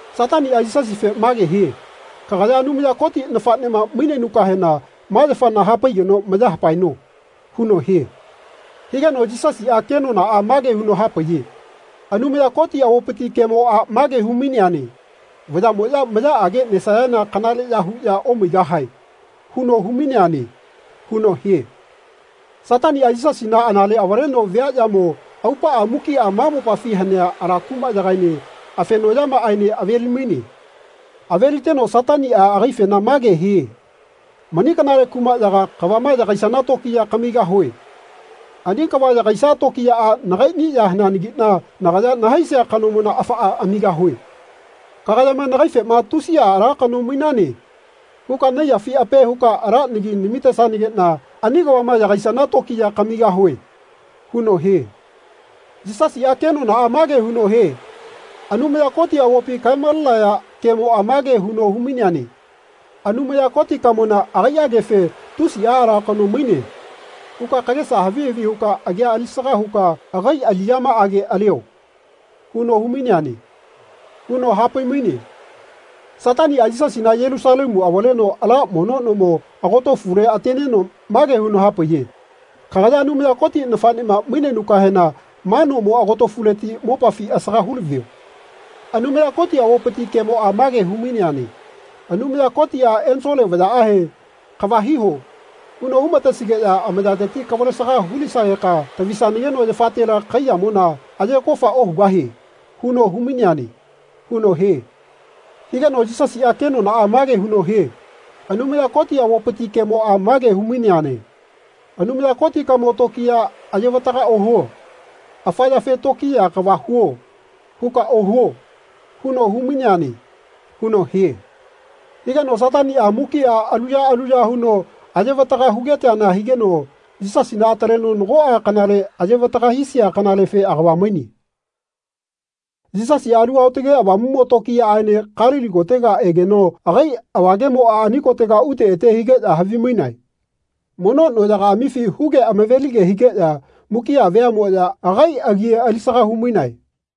Sataniꞌa Yisasife mage hie “Kagaya Anumaya Koti nafaꞌnema mainenukahena ma yafana hapaigeno maya hapaeno.” huno hie. Higeno Yisasiꞌa kenonaꞌa mage huno hapaiye “Anumaya Koti avopiti kemoꞌa mage humaineane ‘Vayaꞌmoꞌya mayaꞌage nesayana kanaleꞌya huꞌya omaigahae.’ huno humaineane.” huno hie. Sataniꞌa Yisasina anale avaleno viaꞌyamo aupaꞌa mukiꞌa ma mopafi hanea ala kumaꞌyagaene afenoꞌyamaꞌaene avelimaine. Aveliteno Sataniꞌa agaifena mage hie “Mani kanale kumaꞌyaga kavama yagaisana tokiya kamigahue. Ani kava yagaisia tokiyaꞌa nagaiꞌni ya haneanagiꞌna nagaya nahaisia kanomona afaꞌa amigahue. Kagayama nagaifema ‘Tusiꞌa ala kano mainane.’ huka naiyafi ape huka ala nagi namitesanageꞌna ani kavama yagaisana tokiya kamigahue.” huno hie. Yisasiꞌa kenonaꞌa mage huno hie “Anumaya Koti avopi kaemalenaya kemoꞌa mage huno humaineane ‘Anumaya Kotikamona agaiꞌagefe ‘Tusiꞌa ala kano maine.’ huka kagesa havi havi huka agia alisaga huka agai aliꞌyamaꞌage alio.’ huno humaineane.” huno hapaimaine. Sataniꞌa Yisasina Yelusalemu avaleno ala mono nomo agotofule ateneno mage huno hapaiye “Kagaya Anumaya Koti nafaꞌnema mainenukahena ma nomo agotofuleti mopafi asaga hulavio. Anumaya Koti avopiti kemoꞌa mage humaineane ‘Anumaya Kotiꞌa ensole vayaꞌahe ‘Kava hiho.’ huno humatesigeꞌya amayateti kavalesaga hulisageka tavisanageno yafatela kaiyamona aye kofa ohugahieꞌ huno humaineane.” huno hie. Higeno Yisasiꞌa kenonaꞌa mage huno hie “Anumaya Koti avopiti kemoꞌa mage humaineane ‘Anumaya Kotikamo tokiya ayevataga ohuo. Afa yafe ‘Tokiya kava huo.’ huka ohuo.’ huno humaineane.” huno hie. Higeno Sataniꞌa mukiꞌa alu ya alu ya huno ayevataga hugeteana higeno Yisasina ataleno nagoꞌa kanale ayevataga hisia kanalefe agava maine. Yisasiꞌa Alu Aotage Avamuꞌmo tokiyaꞌaene Kalili kotega egeno agai avagemoꞌa ani kotega ute ete higeꞌya havimainae. Mono noꞌyagaꞌamifi huge amavelige higeꞌya mukiꞌa veaꞌmoꞌya agai agi alisaga humainae.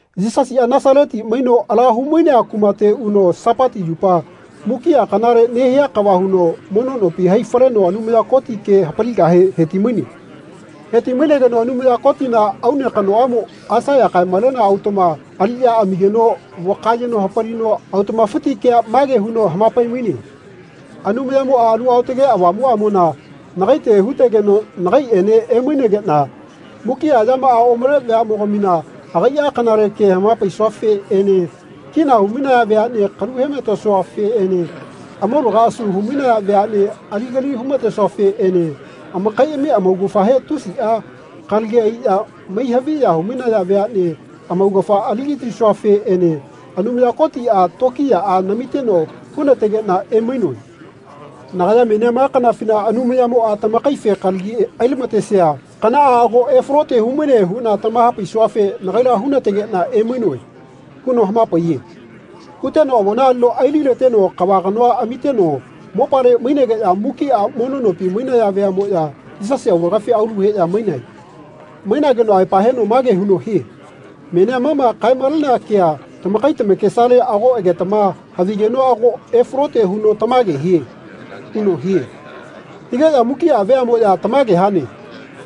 Yisasiꞌa Nasaleti maino ala humainea kumate uno Sapati yupa mukiꞌa kanale nehia kava huno mono nopi hai faleno Anumaya Koti ke hapaligahe hetimaine. Hetimainegeno Anumaya Kotina aune kanoꞌamo Aisaiya kaemalenea autaꞌma aliꞌya amigeno vakayeno hapalino autaꞌmafiti kea mage huno hamapaimaine. “Anumayamoꞌa Alu Aotage Avamuꞌamona nagaite hutegeno nagaiꞌene emainegeꞌna mukiꞌa yamaꞌa omale veaꞌmogamina agaiꞌa kanale ke hamapaisuafeꞌene kina humainaya veaꞌne kalu hematesuafeꞌene amaulaga asu humainaya veaꞌne aligali humatesuafeꞌene amakaiꞌami amaugafahe tusiꞌa kalagi aiꞌya mai haviya humainaya veaꞌne amaugafa aligatisuafeꞌene Anumaya Kotiꞌa tokiyaꞌa namiteno hunategeꞌna emainoe. Nagaya menia ma kanafina Anumayamoꞌa tamakaife kalagi ailamatesia kanaꞌa ago efalote humaine huꞌna tamahapaisuafe nagaila hunategeꞌna emainoe.” huno hamapaiye. Huteno avona alino ailileteno kava kanoa amiteno mopale mainegeꞌya mukiꞌa mono nopi mainaya veaꞌmoꞌya Yisasi aulagafi aulu heꞌya mainae. Mainageno aepa heno mage huno hie “Menia ma ma kaemalenea kea tamakai tamakesale ago egetama havigeno ago efalote huno tamage hie.” huno hie. Higeꞌya mukiꞌa veaꞌmoꞌya “Tamage hane.”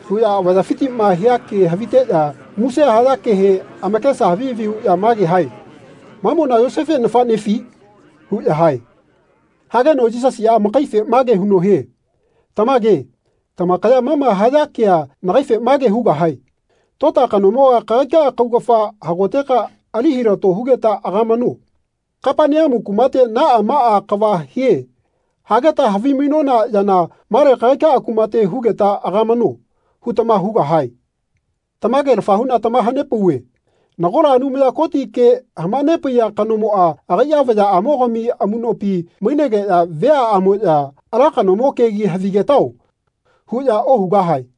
huꞌya avayafitiꞌma hia ke haviteꞌya muse haya kehe amakesa havi havi huꞌya mage hae “Mamona Yosefe nafaꞌnefi?” huꞌya hae. Hageno Yisasiꞌa amakaife mage huno hie “Tamage, tamakaya ma ma haya kea nagaife mage hugahae ‘Tota kanomoga kagaika kaugafa hagoteka ali hilato hugeta agamano. Kapaneamu kumate ‘Naꞌa maꞌa kava hie.’ hageta havimainona yana male kagaika kumate hugeta agamano.’ hutama hugahae. Tamagelafa huꞌna tamahanepauve nagola Anumaya Koti ke hamanepaiya kanomoꞌa agaiꞌa vayaꞌamogami amuꞌnopi mainegeꞌya veaꞌamoꞌya ‘Ala kanomo kegi havigetao.’ huꞌya ohugahae.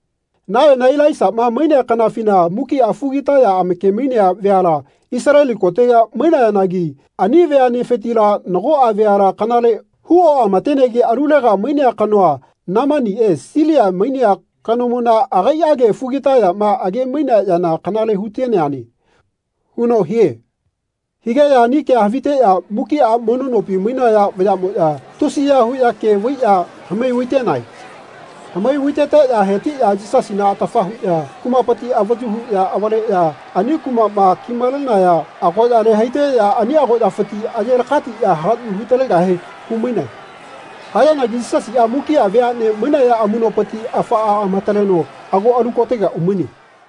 Nayona Ilaisaꞌma mainea kanafina mukiꞌa fugitaya amakemainea veala Isaleli kotega mainayanagi ani veaꞌnefitila nagoꞌa veala kanale hu oꞌamatenegi alulega mainea kanoa, Nemaniꞌe, Silia mainea kanomona agaiꞌage fugitayama agemainea yana kanale huteneane.” huno hie. Higeꞌya ani kea haviteꞌya mukiꞌa mono nopi mainaya vayaꞌmoꞌya tusiya huꞌya ke vaiꞌya hamai vaitenae. Hamai vaiteteꞌya hetiꞌya Yisasina atafa huꞌya kumapiti avayu huꞌya avaleꞌya ani kumaꞌma kimalenaya agoꞌyale haiteꞌya ani agoꞌyafiti aye lakatiꞌya hagaꞌyu hutalegahe humainae. Hayanagi Yisasiꞌa mukiꞌa veaꞌne mainaya amuꞌnopiti afaꞌa amataleno ago alu kotega umaine.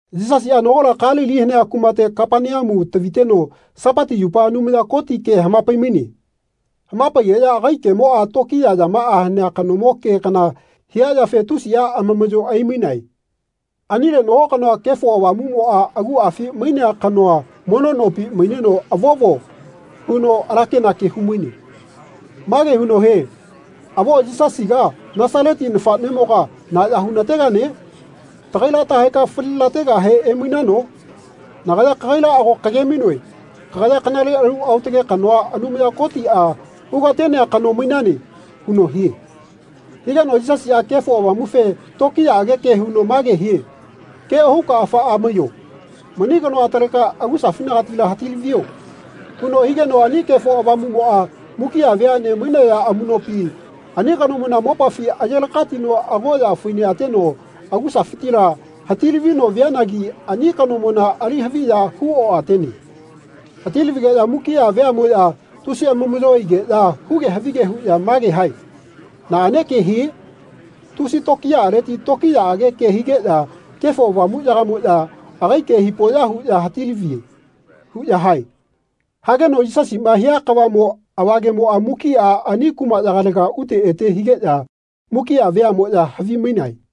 Yisasiꞌa nagola Kalili hanea kumate Kapaneamu taviteno Sapati yupa Anumaya Koti ke hamapaimaine. Hamapaigeꞌya agai kemoꞌa tokiya yamaꞌa hanea kanomo ke kana hia yafe tusiꞌa amamaꞌyo aimainae. Anile nago kanoa Kefo Avamuꞌmoꞌa aguꞌafi mainea kanoa mono nopi maineno “Avovo.” huno alakenake humaine. Mage huno hie “Avo Yisasiga Nasaleti nafaꞌnemoga na ya hulategane? Tagaila tahaeka falilategahe emainano? Nagaya kagaila ago kagemainoe kagaya kanale alu aotage kanoa Anumaya Kotiꞌa hugatenea kano mainane.” huno hie. Higeno Yisasiꞌa Kefo Avamufe tokiyaꞌage ke huno mage hie “Ke ohuka afaꞌa maiyo. Mani kanoa ataleka agusafinagatila hatilavio.” huno higeno ani Kefo Avamuꞌmoꞌa mukiꞌa veaꞌne mainaya amuꞌnopi ani kanomona mopafi ayelakatino agoꞌya fai neꞌateno agusafitila hatilavino vianagi ani kanomona ali haviya hu oꞌatene. Hatilavigeꞌya mukiꞌa veaꞌmoꞌya tusi amamaꞌyo aigeꞌya huge havige huꞌya mage hae “Naꞌane ke hie? Tusi tokiyaꞌaleti tokiyaꞌage ke higeꞌya Kefo Avamuꞌyagamoꞌya agai ke hipoꞌya huꞌya hatilavie.” huꞌya hae. Hageno Yisasiꞌma hia kavaꞌmo avagemoꞌa mukiꞌa ani kumaꞌyagalega ute ete higeꞌya mukiꞌa veaꞌmoꞌya havimainae.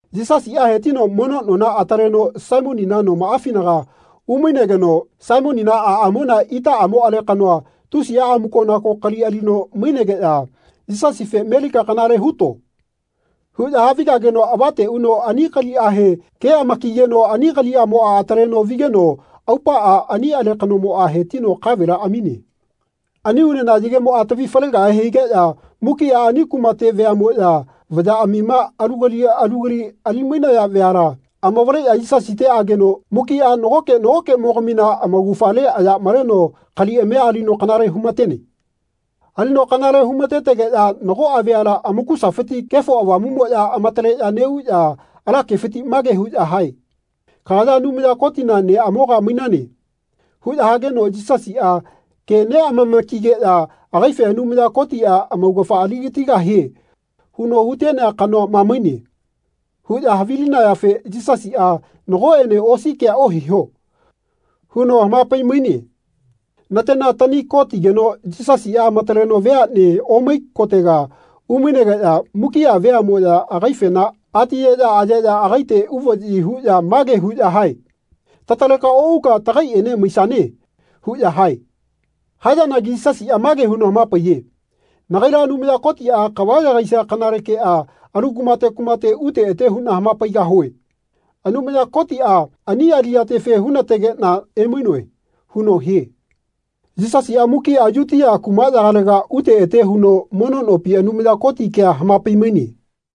Yisasiꞌa hetino mono nona ataleno Saimonina nomaꞌafinaga umainegeno Saimonina aꞌamona itaꞌamo alekanoa tusiꞌa amukonako kali alino mainegeꞌya Yisasife “Melika kanale huto.” huꞌya havigageno avate uno ani kaliꞌahe ke amakigeno ani kaliꞌamoꞌa ataleno vigeno aupaꞌa ani alekanomoꞌa hetino kavela amine. Ani unena yagemoꞌa tavi falegahe higeꞌya mukiꞌa ani kumate veaꞌmoꞌya vayaꞌamima alu kali alu kali alimainaya veala amavaleꞌya Yisasite ageno mukiꞌa nagoke nagokeꞌmogamina amaugafale aya maleno kaliꞌamia alino kanale humatene. Alino kanale humatetegeꞌya nagoꞌa veala amakusafiti Kefo Avamuꞌmoꞌya amataleꞌya neꞌuꞌya ala kefiti mage huꞌya hae “Kagaya Anumaya Kotina neꞌamoga mainane.” huꞌya hageno Yisasiꞌa ke neꞌamamakigeꞌya agaife Anumaya Kotiꞌa “Amaugafa aligatigahie huno hutenea kanoa ma maine.” huꞌya havilinayafe Yisasiꞌa “Nagoꞌene osi kea ohiho.” huno hamapaimaine. Natena tani ko tigeno Yisasiꞌa amataleno veaꞌne omai kotega umainegeꞌya mukiꞌa veaꞌmoꞌya agaifena atiyeꞌya ayeꞌya agaite uvaꞌyi huꞌya mage huꞌya hae “Tataleka oꞌuka tagaiꞌene maisane.” huꞌya hae. Hayanagi Yisasiꞌa mage huno hamapaiye “Nagaila Anumaya Kotiꞌa kava yagaisia kanale keꞌa alu kumate kumate ute ete huꞌna hamapaigahue. Anumaya Kotiꞌa ani aliꞌyatefe hunategeꞌna emainoe.” huno hie. Yisasiꞌa mukiꞌa Yutia kumaꞌyagalega ute ete huno mono nopi Anumaya Koti kea hamapaimaine.